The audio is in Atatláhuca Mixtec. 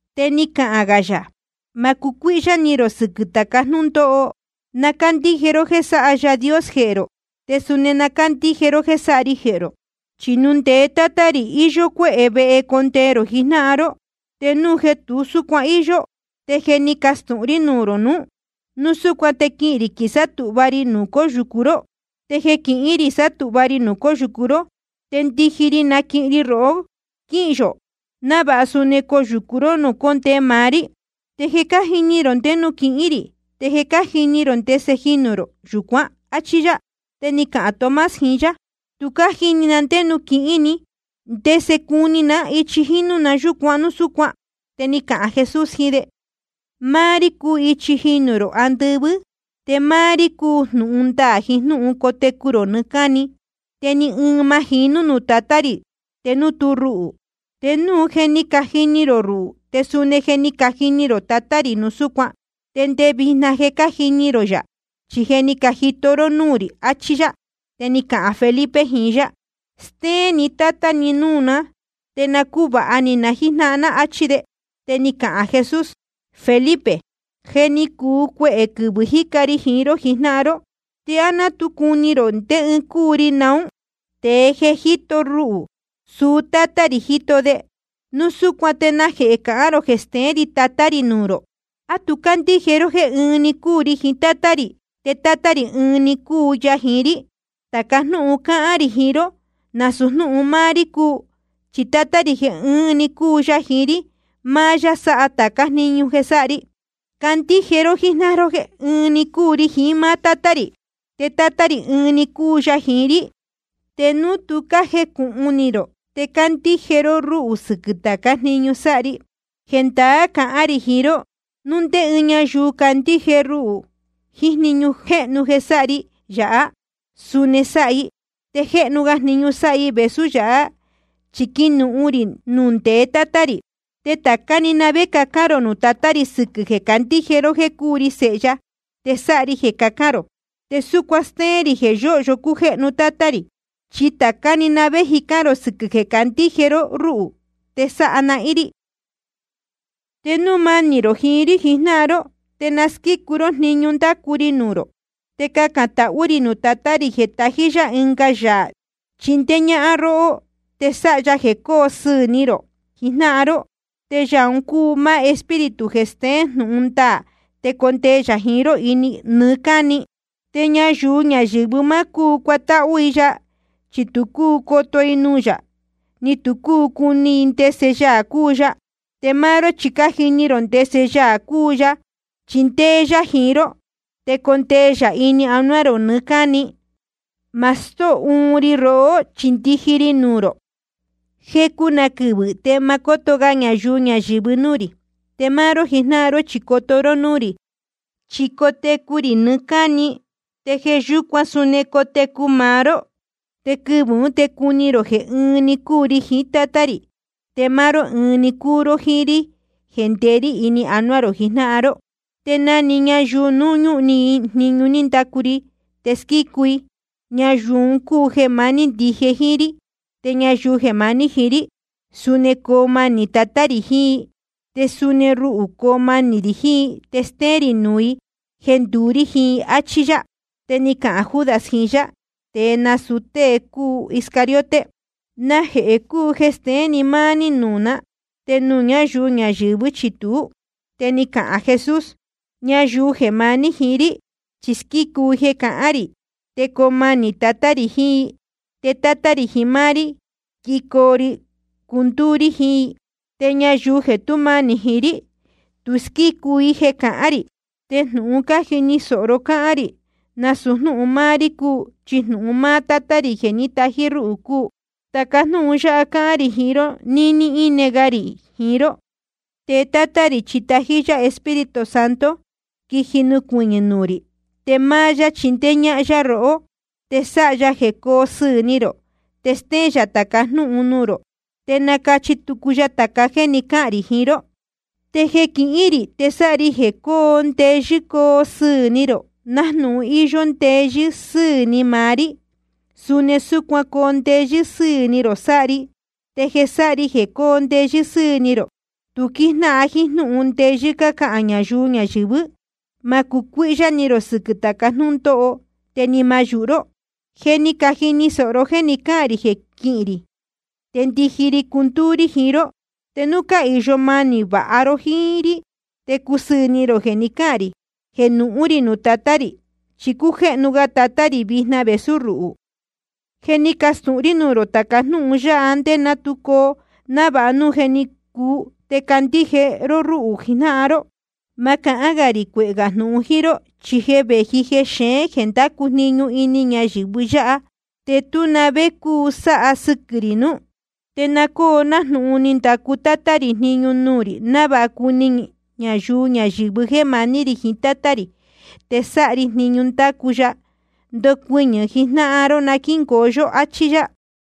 Te ni cahān gā yā: Ma cucuíhyá ni rō sɨquɨ̄ tāca jnúndóho. Na cándíje ró jéē sáha Yaā Dios jehē rō, te suni na cándíje ró jéē sáha ri jehē rō. Chi nuū ndeé Tátá rī, íyó cuéhē vehe condee rō jijnáhan ró. Te núu jeē tu súcuan íyó, te je ni castūhun rí nuū rō nuú. Núu súcuan te quihīn rī quisátūhva ri nuū cóyūcu ró. Te jeē quihín rī sátūhva ri nuū cóyūcu ró, te ndiji ri quinaquihin ri rohó quíhīn yō, návāha suni coyūcu ró nuū cóndee maá rí. Te je cájini rō ndé nuū quihín rī, te cájini rō ndese jinū rō yūcuán. Achí yá. Te ni cahān Tomás jiín yá: Tu cájini na ndé nuū quihín ni, ¿te ndese cuni ná ichi jínú yūcuan núu súcuan? Te ni cahān Jesús jiín de: Máá rí cúu ichi jinū rō andɨvɨ́, te máá rí cúu jnūhun ndaā jiín jnúhun cotecu rō nɨɨ́ cáni. Te ni ɨɨn ma jinú nuū Tatá rī te núu tú ruhū. Te núu je ni cajini rō ruhū, te suni je ni cajini rō Tatá rī núu súcuan. Te ndé vijna je cájini rō yā, chi je ni cajito ró núū rī, achí yá. Te ni cahān Felipe jiín yá: Stéén ni Tátá ni núū ná, te na cúvāha ni na jíjnáhan ná, áchí de. Te ni cahān Jesús: Felipe, je ni cuu cuehē quɨvɨ̄ jíca ri jiín ró jijnáhan ró, ¿te á ná tu cuni rō ndé ɨɨn cúu ri naún? Tēe jeē jíto ruhū, suu Tátá rī jíto de. Núu súcuan ¿te najehē cahán rō jeē steén rī Tatá rī nuū rō? ¿A tu cándíje ró jéē ɨɨn‑ni cúu ri jiín Tátá rī, te Tátá rī ɨɨn‑ni cúu ya jiín rí? Tāca jnúhun cáhán rī jiín ró, nasūu jnúhun máá rí cúu. Chi Tátá rī jeē ɨɨn‑ni cúu ya jiín rí, máá yá sáha tācá jniñu jeē sáha ri. Candíje ró jíjnáhan ró jéē ɨɨn‑ni cúu ri jiín máá Tátá rī, te Tátá rī ɨɨn‑ni cúu ya jiín rí. Te núu tu cájecūhun ni rō, te candíje ró rúhū sɨquɨ̄ tācá jniñu sáha ri. Jendaá cahán rī jiín ró, núu ndé ñáyuu candíje ruhū, jniñu jéhnu jeē sáha ri yāhá, suni sáha i. Te jéhnu ga jniñu sáha i vēsú yāhá, chi quinuhun rī nuū ndeé Tatá rī. Te tācá na‑ni vé cacán rō nuū Tatá rī sɨquɨ̄ jeē cácandíje ró jéē cúu ri Sēhe ya, te sáha ri jeē cacán rō, te súcuan stéén rī jeē yóhyo cújéhnu Tátá rī. Chi tācá na‑ni vé cacán rō sɨquɨ̄ jeē cácandíje ró rúhū, te sáha nahín rí. ’Te núu manī rō jiín rí jijnáhan ró, te na squícu ró jniñu ndácu ri nuū rō. Te cacān tahú rī nuū Tatá rī, te tají yá ɨnga Yaā chindéé ñáhán róhó, te sáha ya jeē cóo sɨɨ̄ ni rō jijnáhan ró. Te Yaā un cúu máá Espíritu jeē steén jnūhun ndaā, te condee yā jiín ró nɨɨ́ cáni. Te ñayuu ñayɨ̄vɨ má cúu cuatáhú i ya, chi tu cúu coto i nuū yā, ni tu cúu cuni i ndese Yaā cúu ya. Te máá ró chi je cájini rō ndese Yaā cúu ya, chi ndéé yá jiín ró, te condee yā ini anuá rō nɨɨ́ cáni. Ma stóo uun ri rohó, chi ndiji ri nuū rō. Jecu na quɨvɨ̄ te ma cóto ga ñayuu ñayɨ̄vɨ núū rī. Te máá ró jijnáhan ró chi coto ró núū rī, chi cotecu rī nɨɨ́ cáni, te jeē yúcuan suni cotecu maá ró. Te quɨvɨ̄ ún te cuni rō jeē ɨɨn‑ni cúu ri jiín Tátá rī, te máá ró ɨɨn‑ni cúu ró jíín rí jeē ndeé rí ini anuá rō jijnáhan ró. Te na‑ni ñayuu núu ñúhun ni i jniñu ní ndacu ri, te squícu i, ñayuu un cúu jeē maní ndije jíín rí. Te ñayuu jeē maní jiín rí, suni coo manī Tatá rī jiín i. Te suni ruhū coo manī rī jiín i, te stéén rī nuū i jeē nduú rí jiín i. Achí yá. Te ni cahān Judas jiín yá (te nasūu tée cúu Iscariote): Najehē cúu jeē steén ni máá ní nuū ná, te nuū ñáyuu ñayɨ̄vɨ́ chi tuú? Te ni cahān Jesús: Ñayuu jeē maní jiín rí, chi cásquícu i jeē cahán rī. Te coo manī Tatá rī jiín i. Te Tátá rī jiín máá rí quijicoo ri cundúú rí jiín i. Te ñayuu jeē tú manī jiín rí, tu cásquícu i jeē cahán rī. Te jnūhun cájini sōho ró cáhán rī, nasūu jnúhun máá rí cúu, chi jnūhun máá Tátá rī jeē ní tají rúhū cúu. ’Tāca jnúhun yáha cáhán rī jiín ró níní íne ga rī jiín ró. Te Tátá rī chi tají yá Espíritu Santo, quiji nucuɨñɨ̄ nuū rī. Te máá yá chindéé ñáhán yá rohó, te sáha ya jeē cóo sɨɨ̄ ni rō. Te stéén yā tāca jnúhun nuū rō, te nacachi tucu ya tāca jéē ni cáhān rī jiín ró. ’Te jeē quihín rī, te sáha ri jeē cóo ndeyɨ́ coo sɨɨ̄ ni rō. Nájnūhun íyó ndeyɨ́ sɨ́ɨ̄ ni maá rí, suni súcuan coo ndeyɨ́ sɨ́ɨ̄ ni rō sáha ri. Te jeē sáha ri jeē cóo ndeyɨ́ sɨ́ɨ̄ ni rō, tu quíjnáhan jíín jnúhun ndeyɨ́ cácahān ñayuu ñayɨ̄vɨ́. Ma cucuíhyá ni rō sɨquɨ̄ tāca jnúndóho, te ni ma yūhu ró. Je ni cajini sōho ró jéē ni cáhān rī jeē quihín rī, te ndiji ri cundúú rí jiín ró. Te núu cáhīyo manī vāha ró jiín rí, te cusɨɨ̄ ni rō jeē ni cáhān rī jeē nuhún rī nuū Tatá rī. Chi cújéhnu ga Tatá rī vijna vēsú ruhū. Je ni castūhun rí nuū rō tāca jnúhun yáha nde ná tu coo, návāha núu je ni cuu, te candíje ró rúhū jijnáhan ró. ’Ma cahán rī cuehē gā jnūhun jíín ró, chi je vēji jexeén jeē ndácu jniñu ini ñayɨ̄vɨ yáha. Te tú na vé cúu sáha sɨquɨ̄ rī nuú. Te na cóo nájnūhun ni ndacu Tátá rī jniñu nuū rī, návāha cuni ñayuu ñayɨ̄vɨ jéē maní rī jiín Tátá rī, te sáha ri jniñu ní ndacu ya. Ndocuɨñɨ̄ jijnáhan ró na quíngoo yó. Achí yá.